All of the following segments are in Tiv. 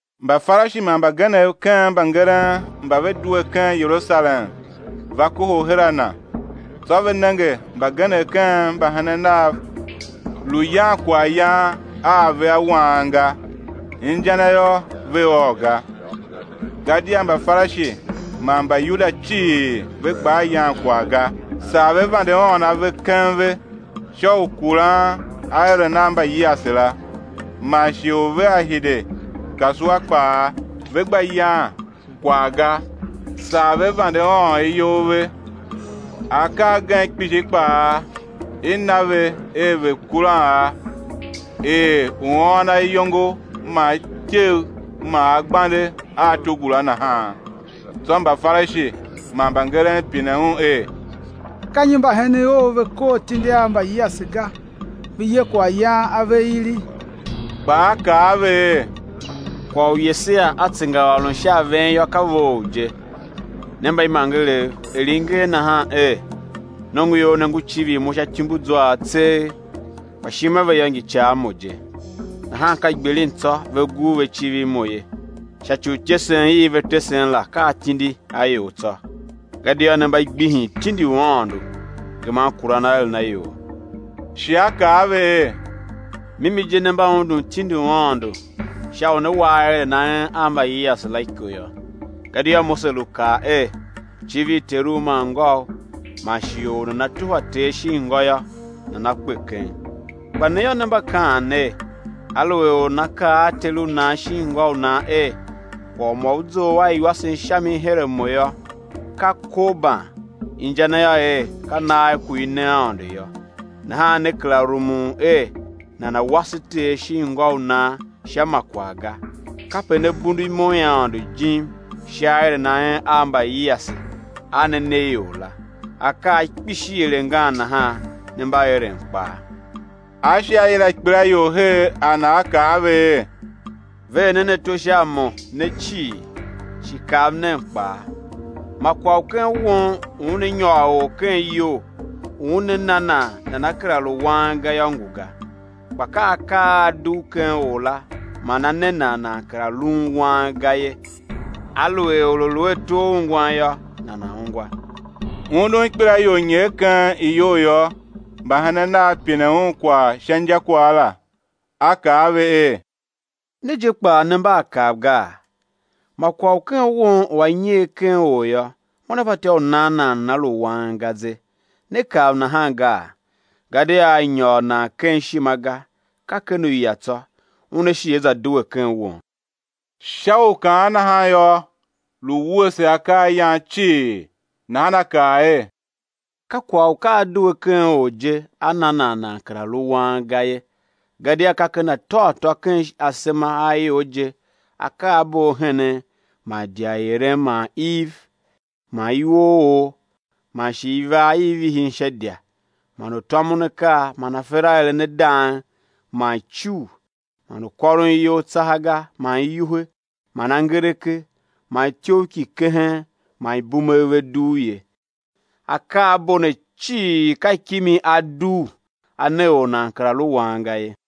Mbafarishi man mbagenev ken mbangeren mba ve due ken Yerusalem va kohol her a Na. Tsô ve nenge mbagenev ken mbahenen Nav lu yan kwaghyan a ave a wang ga, inja na yô, ve ôô ga. Gadia Mbafarishi man Mbayuda cii ve gbaa yan kwagh ga, saa ve vande ôôn ave keng ve, sha u kuran aeren a mbayiase la. Man shighe u vea hide kasua kpaa, ve gba yan kwagh ga, saa ve vande ôôn iyol ve. Akaa agen kpishi kpaa i na ve er ve̱ kuran a, er u ôôn ayongo man ityev man agbande a togula nahan. Tsô Mbafarishi man mbangeren pine Un er: Ka nyi mbahenen Ou ve kor atindi a mbayiase ga, ve ye kwaghyan ave ili? Kpa A kaa a ve er: Kwagh u Yesaia a tsengaôron sha a ven yô, ka vough je, ne mbaimangerev, er i nger nahan er: Nongoior ne ngu civir Mo sha ityumbuzwaav tseegh, kpa ishima ve yô, ngi ica a Mo je; nahan ka gbilin tsô, ve gur ve civir Mo ye, sha ci u ityesen i ve tesen la, ka atindi a ior tsô. Gadia ne mba gbihin tindi u Aôndo, geman kuran aeren a ior. Shi A kaa a ve er: Mimi je ne mba undun tindi u Aôndo, sha u ne wa aeren a en a mbayiase la iko yô. Gadia Mose lu kaa er: Civir teru man ngôu; man shi: Or u nana tuhwa ter shin ngô yô, nana kpe keng. Kpa ne yô, ne mba kaan ner, aluer or nana kaa a ter u nan shin ngô u nan er: Kwagh u ma u zough a iwasen sha mi her a mo yô, ka korban (inja na yô er, ka nagh ku i ne Aôndo yô) nahan ne kera rumun er nana̱ wase ter shin ngô u nan sha ma kwagh ga. Kape ne bundu imo i Aôndo jim sha aeren a en a mbayiase a ne ne ior la. Akaa kpishi er angan nahan ne mba eren kpaa. A shi A yila ikpelaior her a Na, A kaa a ve er: Ver nen ato sha a Mo, ne cii, shi kav nen kpaa: Ma kwagh u ken won u una nyôr or ken iyol, u una na nan nana kera lu wang ga yô, ngu ga; kpa ka akaa a a dugh ken or la man a ne nan, nan kera luun wang ga ye. [ Aluer or a lu a ato a ungwan yô, nana̱ ungwa.] Undun ikpelaior nyer ken iyou yô, mbahenen Nav pine Un kwagh sha injakwagh la. A kaa a ve er: Ne je kpaa, ne mba a kav gaa? Ma kwagh u ken won u a nyer ken or yô, una fatyô u nan nan nana lu wang ga ze; ne kav nahan gaa? Gadia a nyôr nan ken ishima ga, ka ken uya tsô, una shi á za due ken won. Sha u kaan nahan yô, lu wuese akaayan cii. Nahan A kaa er: Ka kwagh u ka a due ken or je, a na nan, nan kera lu wang ga ye. Gadia ka ken ateghatô ken asema a ior je akaabo a henen, man idya i eren, man iv, man iwooor, man shi ivaa i vihin sha idya, man u tômon akaa, man afer a eren a dang, man icugh, man u kôron iyol tsaha ga, man iwuhe, man angereke, man ityough ki kehen, man ibumegh ve dugh ye. Akaabo ne cii ka kimi a dugh, a ne or nan kera lu wang ga ye.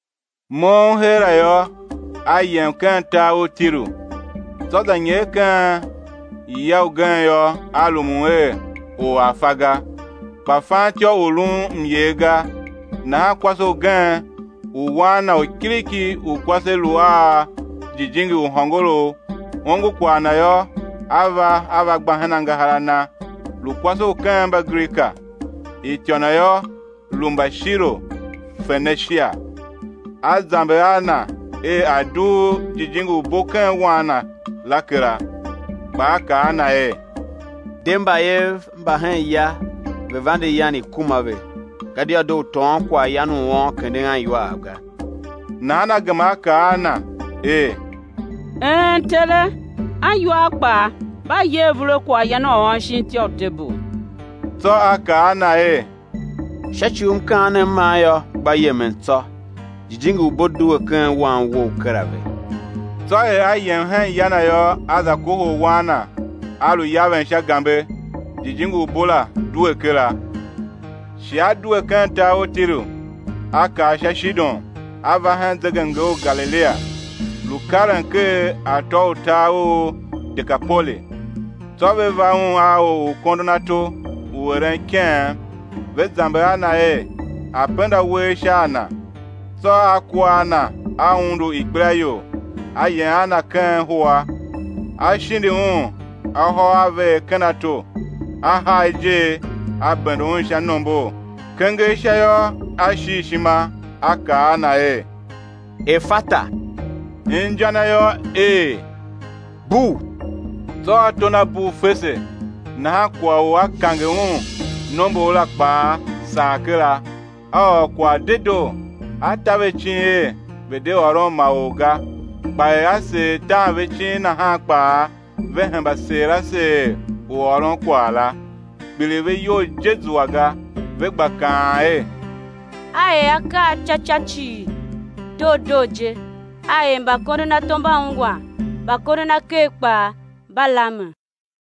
Moughon heera yô, A yem ken tar u Tiru. Tsô za nyer ken ya ugen yô, A rumun er or a̱ fa ga; kpa fan ityô u lun myer ga. Nahan kwase ugen u wan na u kiriki u kwase lu a jijingi u hôngorough, ongo kwagh Na yô, a va, a va gba hen angahar a Na. Lu kwase u ken Mbagrika, ityô na yô, lu Mbashiro-Fenishia. A zamber a Na er, A̱ dugh jijingi u bo ken wan na la kera. Kpa A kaa a na er: De, mbayev mba hen ya ve̱ vande yan i̱ kuma ve, gadia doo u tôôn kwaghyan u uôn, kenden aniwaav ga. Nahan a gema a kaa a Na er: Een Tere, aniwaav kpaa mba ye avur a akaayan a uôn shin ityô i tebul. Tsô A kaa a na er: Sha ci u mkaanem man yô, gba yemen tsô, jijingi u bo due ken wan wou kera ve. Tsô er a yem hen ya na yô, a za kohol wan na, a lu yaven sha gambe, jijingi u bo la due kera. Shi A due ken tar u Tiru, A kar sha Shidon, A va hen zegemnger u Galilia, lu karen ker atô u tar u Dekapoli. Tsô ve va Un a or u kondon ato, u eren ikeghem, ve zamber a Na er, A̱ penda uwegh sha a na. Tsô A kua a na A undu ikpelaior, A yem a na ken huwa, A shindi un ahôaveegh ken ato, A haa ijer, A bende un sha nombor. Kenger sha yô, A shil ishima, A kaa a na er: Efata! Inja na yô, er: Bugh! Tsô ato na bugh, fese nahan kwagh u a kange un nombor la kpaa sagh kera, a ôr kwagh dedoo. A ta ve icin er, ve̱ de ôron ma or ga; kpa er A seer tan ve icin nahan kpaa, ve hemba seer a seer u ôron kwagh la. Kpiligh ve iyol je zua ga, ve gba kaan er: A er akaa ca ca cii doo doo je, A er mbakondonato mba ungwan, mbakondonaker kpaa mba lamen.